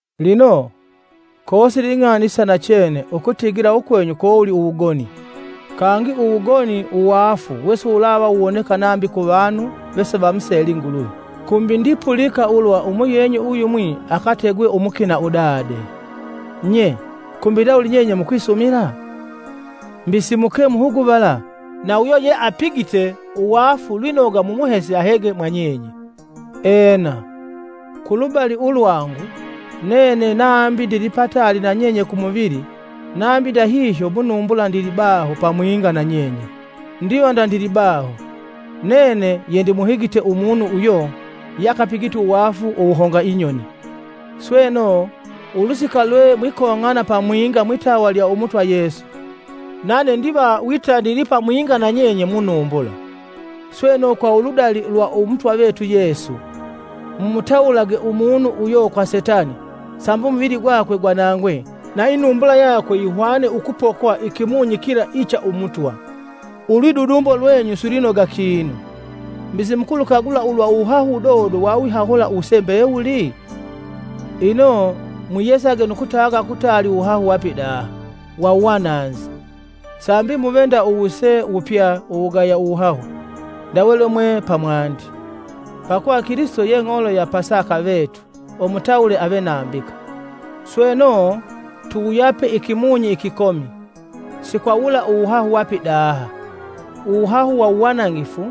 Lino, kosili ing'ani isa nachene ukutigila ukwenyu kowoli uwugoni, kangi uwugoni uwaafu wesiwulava wuwoneka nambi kuvanu, vesivamuseli Nguluvi kumbi ndipulika ulwa umuyenyu uyumwi akategwe umukina udade! Nye! Kumbi ndawuli nyenye mukwisumila? Mbi si muke muhuguvala, na uyo yeipigite uwaafu lwinoga mumuhese ahege mwa nyenye. Ena, kulubali ulwangu, nene nambi ndilipataali nanyenye ku muvili, nambi ndahihyo mu numbula ndilibaho pamwinga na nyenye, ndiva ndandilibaho, nene yendimuhigite umunu uyo yeakapigite uwaafu uwuhonga inyoni. Sweno, ulusika lwe mwikong'ana pamwinga mwitawa lya Umutwa Yesu, nane ndiva wita ndili pamwinga na nyenye kwa inumbula, sweno kwa uludali ulwa Umutwa vetu Yesu, mumutawulage umunu uyo kwa Setani sambi umuvili gwakwe gwanangwe na inumbula yakwe yihwane ukupokwa ikimunyi kila icha Umutwa. Ulwidudumbo lwenyu silwinoga kinu! Mbi, simukulukagula ulwa uwuhahu wudodo wawihahula uwuse mbewuli? Ino, mwiyesage nu kutaga kutaali uwuhahu wa pidaha, wa uwananzi, sambi muve vapya uwuhahu ndawe mwiwali. Pakuva Kilisito ye ng'olo ya Pasaka vetu umutawule ave nambika. Sweno, tuwuyape ikimunyi ikikomi, si kwa wula uwuhahu wa pidaha, uwuhahu wa uwanangifu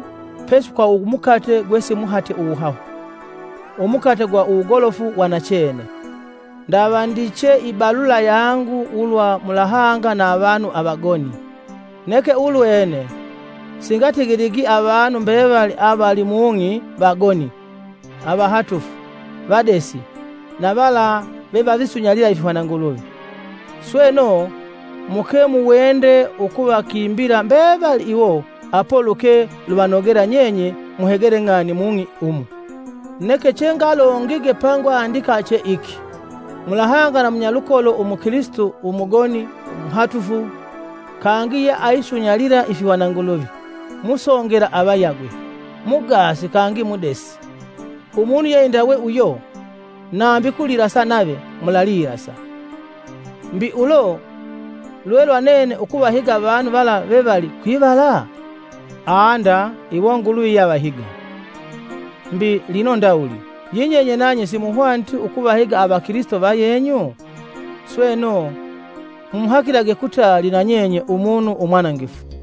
pesi kwa umukate gwesimuhate uwuhahu, umukate ugwa uwugolofu wa nachene. Ndavandiche ibalula yangu ulwa mulahanga na avanu avagoni. Neke ulwene singatigiligi avanu mbevali avali mung'i vagoni, avahatufu, vadesi na vala vevavisunyalila ifihwananguluvi. Sweno, muke muwende ukuvakimbila mbevali iwo apo luke luvanogela nyenye muhegele ng'ani mung'i umu! Neke chengalongige pengwandika che iki: Mulahanga na munyalukolo umukilisito umugoni, muhatufu, kangi aisunyalila ifihwananguluvi, musongela avayagwe, mugaasi kangi mudesi. Umunu yeindawe uyo, nambi ukulilasa nave, mulalilasa. Mbi, ulo lwelwa nene ukuvahiga avanu vala vevali kwivala? Aa nda iwo Nguluvi yeavahiga. Mbi, lino ndawuli, yinyenye nanye simuhwaniti ukuvahiga avakilisito vayenyu? Sweno, mumuhakilage kutali na nyenye umunu umwanangifu!